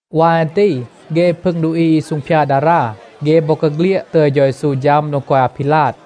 วาย อัน ตี เฆ พึง ดูอี อี ซูงพยาด ดารา, เฆ บอกาเฆลียด ตึย เฌา เยซู ฌัม โดง กอย อาพีลาด.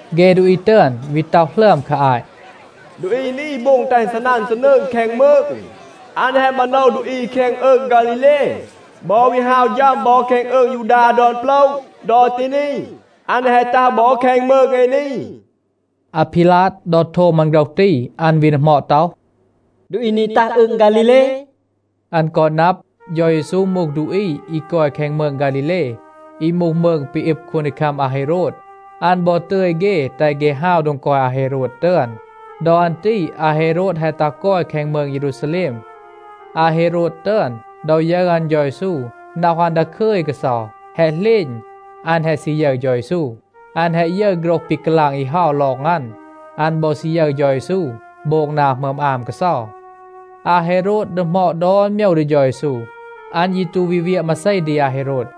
เฆ ดูอี ตึอน วี ต็อห หลึอม คา อาต “ดูอี นี โบง แตห อึณ ซีนัน ซีนืง แคง มืง. อัน แฮะ มาโนว ดูอี แคง อืง ฆาลีเล บอ วี ฮาว ฌัม บอ แคง อืง ยูดา ดอน โปละ. ดอ ตี นี, อัน แฮะ ตัห บอ แคง มืง เอ นี.” อาพีลาด, ดอ โทม อัน โฆรห ตี, อัน วี ดีหมอด ต็อห, “ดูอี นี ตัห อืง ฆาลีเล?” อัน กอ นับ, เฌา เยซู มูห ดูอี อี กอย แคง มืง ฆาลีเล อี มูห มืง ปี อึบ คูนดีคัม อาเฮโรด, อัน บอ ตึย เฆ แตห เฆ ฮาว โดง กอย อาเฮโรด ตึอน. ดอ อัน ตี อาเฮโรด แฮะ ตัห กอย แคง มืง เยรูซาแลม. อาเฮโรด ตึอน, ดอ ยึร อัน เฌา เยซู, น็อห อัน ดาคึย กาเซา. แฮะ เหลณ, อัน แฮะ ซี ยึร เฌา เยซู. อัน แฮะ ยึร โฆรห ปี กาลาง อี เฮา ลอง อัน. อัน บอ ซี ยึร เฌา เยซู โบง นา หมึอม อาม กาเซา. อาเฮโรด ดีหมอด ดอน โมยว ดี เฌา เยซู. อัน ยี ตู วี เวียะ มาเซ ดี อาเฮโรด.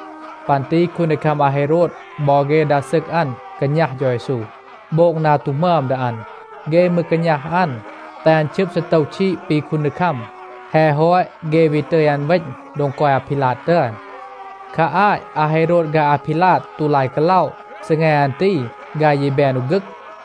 ปัน ตี คูนดีคัม อาเฮโรด บอ เฆ ดา ซึก อัน กาณัห เฌา เยซู, โบง นา ตู หมึอม ดี อัน. เฆ มืร กาณัห อัน, แตห อัน ชึบ ซีโตว ชีด ปี คูนดีคัม. แฮะ ฮอต, เฆ วี ตึย อัน เวณ โดง กอย อาพีลาด ตึอน. คา อาต อาเฮโรด ฆาย อาพีลาด ตู ลาย กาล็อะ. ซีแง อัน ตี, ฆาย ยี แบน อู ฆึก.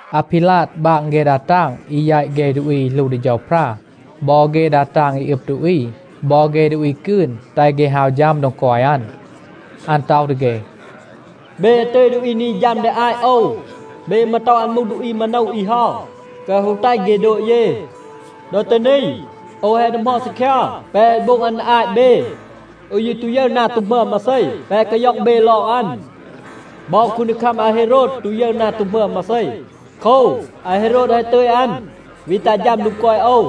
อาพีลาด บาง เฆ ดา ตาง อี แยต เฆ ดูอี อี หลู ดี เฌาพรา บอ เฆ ดา ตาง อี อึบ ดูอี บอ เฆ ดูอี กืน, แตห เฆ ฮาว ฌัม โดง กอย อัน. อัน ต็อห ดี เฆ, “เบ แฮะ ตึย ดูอี นี ฌัม ดี อาต โอว. เบ มืร ต็อห อัน มูห ดูอี มาโนว อี เฮา แกวะ ฮู แตห เฆ โดบ เย. ดอ ตี นี โอว แฮะ ดีหมอด ซีคยา แปะ แฮะ โบง อัน ดี อาต เบ. โอว ยี ตู ยึร นา ตู หมึอม มาเซ แปะ แฮะ กาย็อง เบ ลอง อัน. บอ คูนดีคัม อาเฮโรด ตู ยึร นา ตู หมึอม มาเซ. โคว, อาเฮโรด แฮะ ตึย อัน วี ตัห ฌัม โดง กอย โอว.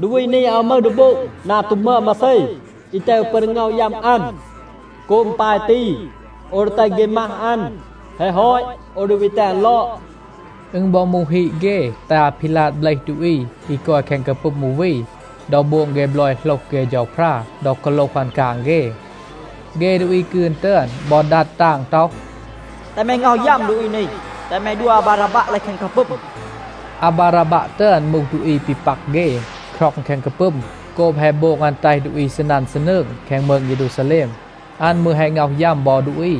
ดูอี นี อาว มึห ดี โบง นา ตู หมึอม มาเซ, อี แตห โอว ปึอน ดี ง็อห ยัม อัน. โกบ อึณ ปาย ตี, โอว ดี แตห เฆ มัห อัน, แฮะ ฮอต, โอว ดี วี แตห อัน ลอด.” อึณ บอ มูห ฮีด เฆ, แตห อาพีลาด เบลห ดูอี อี กอย แคง กาปึม อู วี ดอ โบง เฆ บลอย โหลห เฆ เฌาพรา ดอ กาโลห อัน กาง เฆ.a เฆ ดูอี กืน ตึอน บอ ดัด ตาง ต็อห, “แตห แม ง็อห ยัม ดูอี นี. แตห แม ดัว อาบาราบัะ เลห แคง กาปึม.” อาบาราบัะ ตึอน มูห ดูอี ปี ปัก เฆ, คร็อง แคง กาปึม โกบ แฮะ โบง อัน แตห ดูอี ซีนัน ซีนืง แคง มืง เยรูซาแลม. อัน มืร แฮะ ง็อห ยัม บอ ดูอี.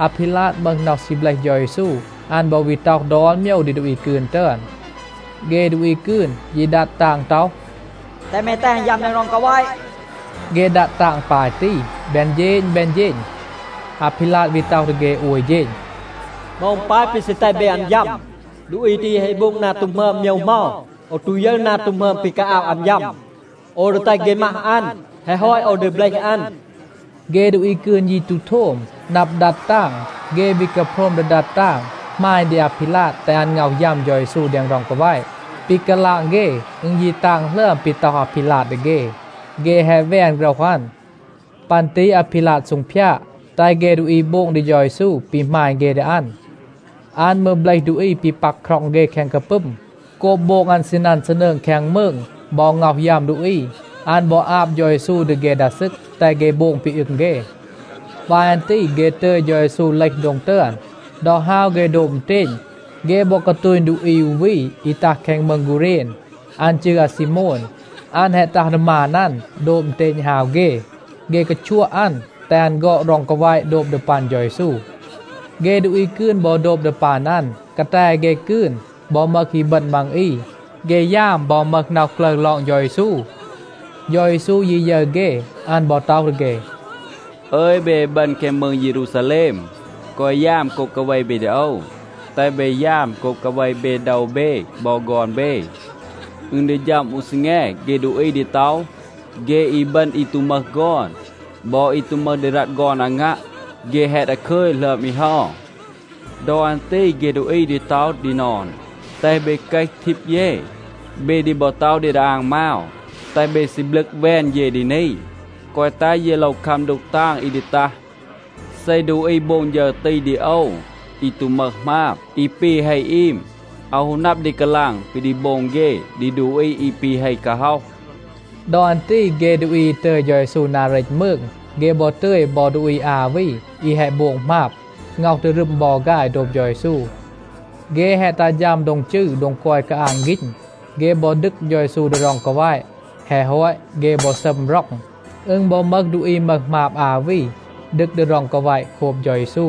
อาพีลาด มึห น็อห ซี เบลห เฌา เยซู. อัน บอ วี ต็อห ดอน โมยว ดี ดูอี กืน ตึอน. เฆ ดูอี กืน ยี ดัด ตาง ต็อห, “แตห แม แตห อัน ยัม แดง ร็อง กาแวะ.” เฆ ดัด ตาง ปาย ตี แบน เฌณ แบน เฌณ. อาพีลาด วี ต็อห ดี เฆ โอย เฌณ. “เหมา อึณ ปาย ปี ซี แตห เบ อัน ยัม? ดูอี ตี แฮะ โบง นา ตู หมึอม โมยว เหมา? โอว ตู ยึร นา ตู หมึอม ปี กาอาบ อัน ยัม. โอว ดี แตห เฆ มัห อัน, แฮะ ฮอต, โอว ดี เบลห อัน.” เฆ ดูอี กืน ยี ตู โทม, นับ ดัด ตาง. เฆ วี กาโพรม ดี ดัด ตาง, หมาณ ดี อาพีลาด แตห อัน ง็อห ยัม เฌา เยซู แดง ร็อง กาแวะ. ปี กาลาง เฆ, อึณ ยี ตาง หลึอม ปี ต็อห อาพีลาด ดี เฆ. เฆ แฮะ แวน โฆรห อัน. ปัน ตี อาพีลาด ซูงพยาด, แตห เฆ ดูอี โบง ดี เฌา เยซู ปี หมาณ เฆ ดี อัน. อัน มืร เบลห ดูอี ปี ปัก คร็อง เฆ แคง กาปึม โกบ โบง อัน ซีนัน ซีนืง แคง มืง บอ ง็อห ยัม ดูอี. อัน บอ อาบ เฌา เยซู ดี เฆ ดา ซึก, แตห เฆ โบง ปี อึง เฆ. วาย อัน ตี เฆ ตึย เฌา เยซู เลห โดง ตึอน. ดอ ฮาว เฆ โดบ อึณเตณ, เฆ บอ กาตูณ ดูอี อู วี อี ตัห แคง มืง กูเรณ. อัน จืร อาซีโมน. อัน แฮะ ตัห ดี มาน อัน, โดบ อึณเตณ ฮาว เฆ. เฆ กาชัวะ อัน, แตห อัน ฆอด ร็อง กาแวะ โดบ ดี ปัน เฌา เยซู. เฆ ดูอี กืน บอ โดบ ดี ปัน อัน. กาแต เฆ กืน บอ มึห อีบึณ มัง อี. เฆ ยาม บอ มึห น็อห กลึร ลอง เฌา เยซู. เฌา เยซู ยี ยึร เฆ, อัน บอ ต็อห ดี เฆ, “อึย เบ อีบึณ แคง มืง เยรูซาแลม, แกวะ ยาม โกบ กาเว เบ ดี โอว. แตห เบ ยาม โกบ กาเว เบ โดว เบ บอ ฆอน เบ. อึณ ดี ฌัม อู ซีแง, เฆ ดูอี ดี ต็อห, ‘เฆ อีบึณ อี ตู มึห ฆอน บอ อี ตู มึห ดี รัต ฆอน อางัะ, เฆ แฮะ ดาคึย หลึอม อี เฮา.’ ดอ อัน ตี เฆ ดูอี ดี ต็อห ดี นอน, ‘แตห เบ เกห ทีบ เย.’ เบ ดี บอ ต็อห ดี ดาอาง มาว, ‘แตห เบ ซีบลึก แวน เย ดี นี, แกวะ แตห เย โลว คัม ดูก ตาง อี ดี ตัห.’ เซ ดูอี โบง ฌึร ตี ดี โอว, อี ตู มึห หมาบ, อี ปี เฮ อีม, อาว ฮู นับ ดี กาลาง ปี ดี โบง เฆ ดี ดูอี อี ปี เฮ กาฮ็อห.” ดอ อัน ตี เฆ ดูอี อี ตึย เฌา เยซู นา เรต มืง, เฆ บอ ตึย บอ ดูอี อา วี, อี แฮะ โบง หมาบ, ง็อห ดีรึม บอ ฆาย โดบ เฌา เยซู. เฆ แฮะ ตัห ฌัม โดง จืร โดง กอย กาอาง ฆีณ, เฆ บอ ดึก เฌา เยซู ดี ร็อง กาแวะ. แฮะ ฮอต, เฆ บอ ซัม ร็อง. อึณ บอ มึห ดูอี มึห หมาบ อา วี ดึก ดี ร็อง กาแวะ โคบ เฌา เยซู.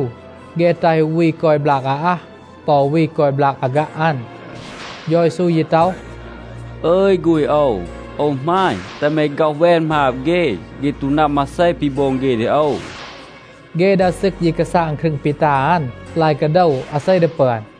เฆ แตห อู วี กอย บลาก อาอัห ปอ อู วี กอย บลาก อาฆัะ อัน. เฌา เยซู ยี ต็อห, “อึย ฆูณ โอว, โอว หมาณ, แตห แม ฆ็อห แวน หมาบ เฆ. เฆ ตู นับ มาเซ ปี โบง เฆ ดี โอว.” เฆ ดา ซึก ยี กาซาง ครึง ปี ตา อัน, ลาย กาโดว, อาเซ ดี ปึอน.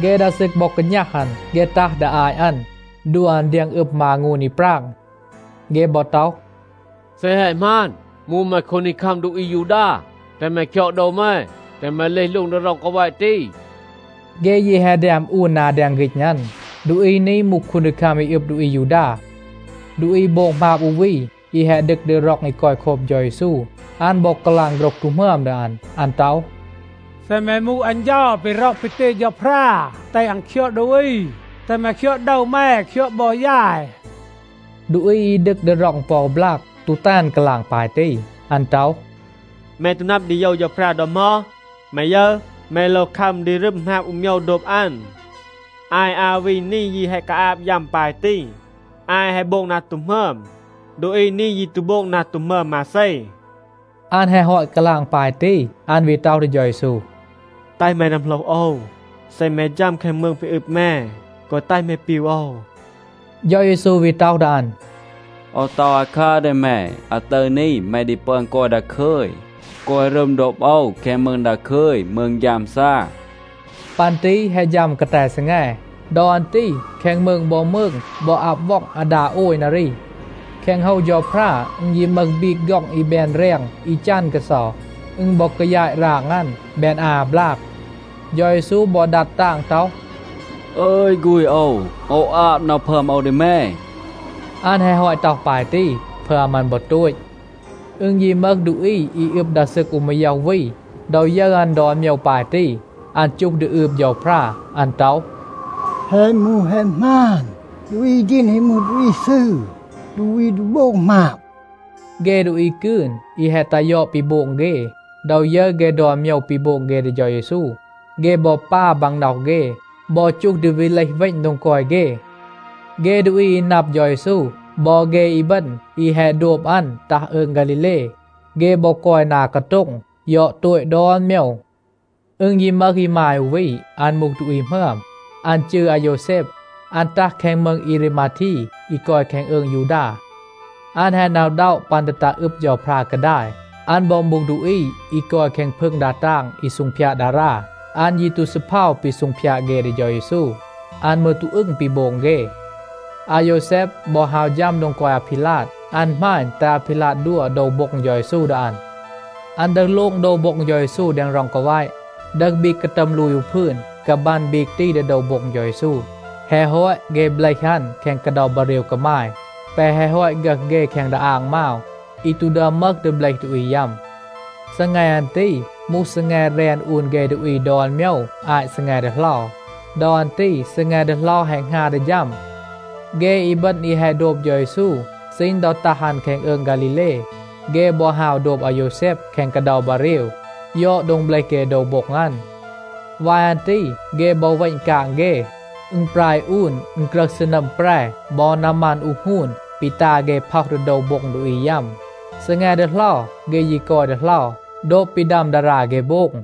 เฆ ดา ซึก บอ กาณัห อัน. เฆ ตัห ดี อาต อัน, ดัว อัน เดียง อึม มางูน อี ปราง. เฆ บอ ต็อห, “เซ แฮะ หมาน, มูห แม คูนดีคัม ดูอี อายูดา, แตห แม คยอด โดว แม, แตห แม เลห โลง แดง ร็อง กาแวะ ตี.” เฆ ยี แฮะ แดม อูน นา แดง ฆีณ อัน, “ดูอี นี มูห คูนดีคัม อี อึบ ดูอี อายูดา.” ดูอี โบง หมาบ อู วี, อี แฮะ ดึก ดี ร็อง อี กอย โคบ เฌา เยซู, อัน บอ กาลาง โฆรห ตู หมึอม ดี อัน. อัน ต็อห, “เซ แม มูห อัน เฌา ปี ร็อห ปี ตึย เฌาพรา แตห อัน คยอด ดูอี, แตห แม คยอด โดว แม, คยอด บอ ยาย.” ดูอี อี ดึก ดี ร็อง ปอ อู บลาก ตู แตห อัน กาลาง ปาย ตี. อัน ต็อห, “แม ตู นับ ดี โยว เฌาพรา ดอ เหมา? แม ยึร, แม โลว คัม ดี รึม หมาบ อู โมยว โดบ อัน. อาย อา วี นี ยี แฮะ กาอาบ ยัม ปาย ตี. อาย แฮะ โบง นา ตู หมึอม. ดูอี นี ยี ตู โบง นา ตู หมึอม มาเซ.” อัน แฮะ ฮอต กาลาง ปาย ตี, อัน วี ต็อห ดี เฌา เยซู, “แตห แม นัมโหลห โอว. เซ แม ฌัม แคง มืง ปี อึบ แม, แกวะ แตห แม ปีว โอว.” เฌา เยซู วี ต็อห ดี อัน, “โอว ต็อห อาคัร ดี แม, อาตึร นี แม ดี ปึอน กอย ดาคึย, กอย รึม โดบ โอว แคง มืง ดาคึย, มืง ฆยามซา.” ปัน ตี แฮะ ฌัม กาแต ซีแง. ดอ อัน ตี แคง มืง บอ มืง บอ อับ ว็อง อาดา โอย นารี. แคง โฮว เฌาพรา อึณ ยี มึห บีก ฆ็อง อี แบน แรง อี จัน กาเซา. อึณ บอ กายาต ราง อัน, แบน อา บลาก. เฌา เยซู บอ ดัด ตาง ต็อห, “อึย ฆูณ, โอว อาบ น็อห พึอม โอว ดี แม,” อัน แฮะ ฮอต ต็อห ปาย ตี, พึอม อัน บอ โตต. อึณ ยี มึห ดูอี อี อึบ ดา ซึก อู มาย็อห วี, ดอ ยึร อัน ดอน โมยว ปาย ตี, อัน จูห ดี อืบ เฌาพรา. อัน ต็อห, “แฮะ มูห, แฮะ หมาน, ดูอี ตี แฮะ มูห ดูอี ซืร, ดูอี ตู โบง หมาบ.” เฆ ดูอี กืน, อี แฮะ ตัห ยอด ปี โบง เฆ, ดอ ยึร เฆ ดอน โมยว ปี โบง เฆ ดี เฌา เยซู, เฆ บอ ปา บางน็อห เฆ, บอ จูห ดี วี เลห เวณ โดง กอย เฆ. เฆ ดูอี อี นับ เฌา เยซู บอ เฆ อีบึณ อี แฮะ โดบ อัน ตัห อืง ฆาลีเล, เฆ บอ กอย นา กาโต็ง ยอด โตต ดอน โมยว. อึณ ยี มึห อีมาย อู วี, อัน มูห ดูอี หมึอม. อัน จืร อาโยวแซบ. อัน ตัห แคง มืง เอรีมาที อี กอย แคง อืง ยูดา. อัน แฮะ หน็อะ อึณด็อะ ปัน ดี ตัห อึบ เฌาพรา กาดาย. อัน บอ มูห ดูอี อี กอย แคง พึง ดา ตาง อี ซูงพยาด ดารา. อัน ยี ตู ซีเพา ปี ซูงพยาด เฆ ดี เฌา เยซู. อัน มืร ตู อึง ปี โบง เฆ. อาโยวแซบ บอ ฮาว ฌัม โดง กอย อาพีลาด. อัน หมาณ, แตห อาพีลาด ดัว โดว โบ็ง เฌา เยซู ดี อัน. อัน ดึห โลง โดว โบ็ง เฌา เยซู แดง ร็อง กาแวะ, ดึห บีก กาตัม ลูย อู พืน, กาบัน บีก ตี ดี โดว โบ็ง เฌา เยซู. แฮะ ฮอต, เฆ เบลห อัน แคง กาเดา บาเรว กามาย แปะ แฮะ ฮอต ฆึห เฆ แคง ดาอาง มาว, อี ตู ดึอม มึห ดี เบลห ดูอี ยัม. ซีแง อัน ตี มูห ซีแง แรน อูน เฆ ดูอี ดอน โมยว อาต ซีแง ดีเหลา. ดอ อัน ตี ซีแง ดีเหลา แฮะ หงา ดี ฌัม. เฆ อีบึณ อี แฮะ โดบ เฌา เยซู ซีณ ดอ ตัห อัน แคง อืง ฆาลีเล, เฆ บอ ฮาว โดบ อาโยวแซบ แคง กาเดา บาเรว, ยอด โดง เบลห เฆ โดว โบ็ง อัน. วาย อัน ตี เฆ บอ เวณ กาง เฆ, อึณปราย อูน อึณกรึห ซีนัม แปร บอ นามัน อูห หงูน ปี ตา เฆ พ็อห ดี โดว โบ็ง ดูอี ยัม. ซีแง ดีเหลา เฆ ยี กอย ดีเหลา, โดบ ปี ดัม ดารา เฆ โบง.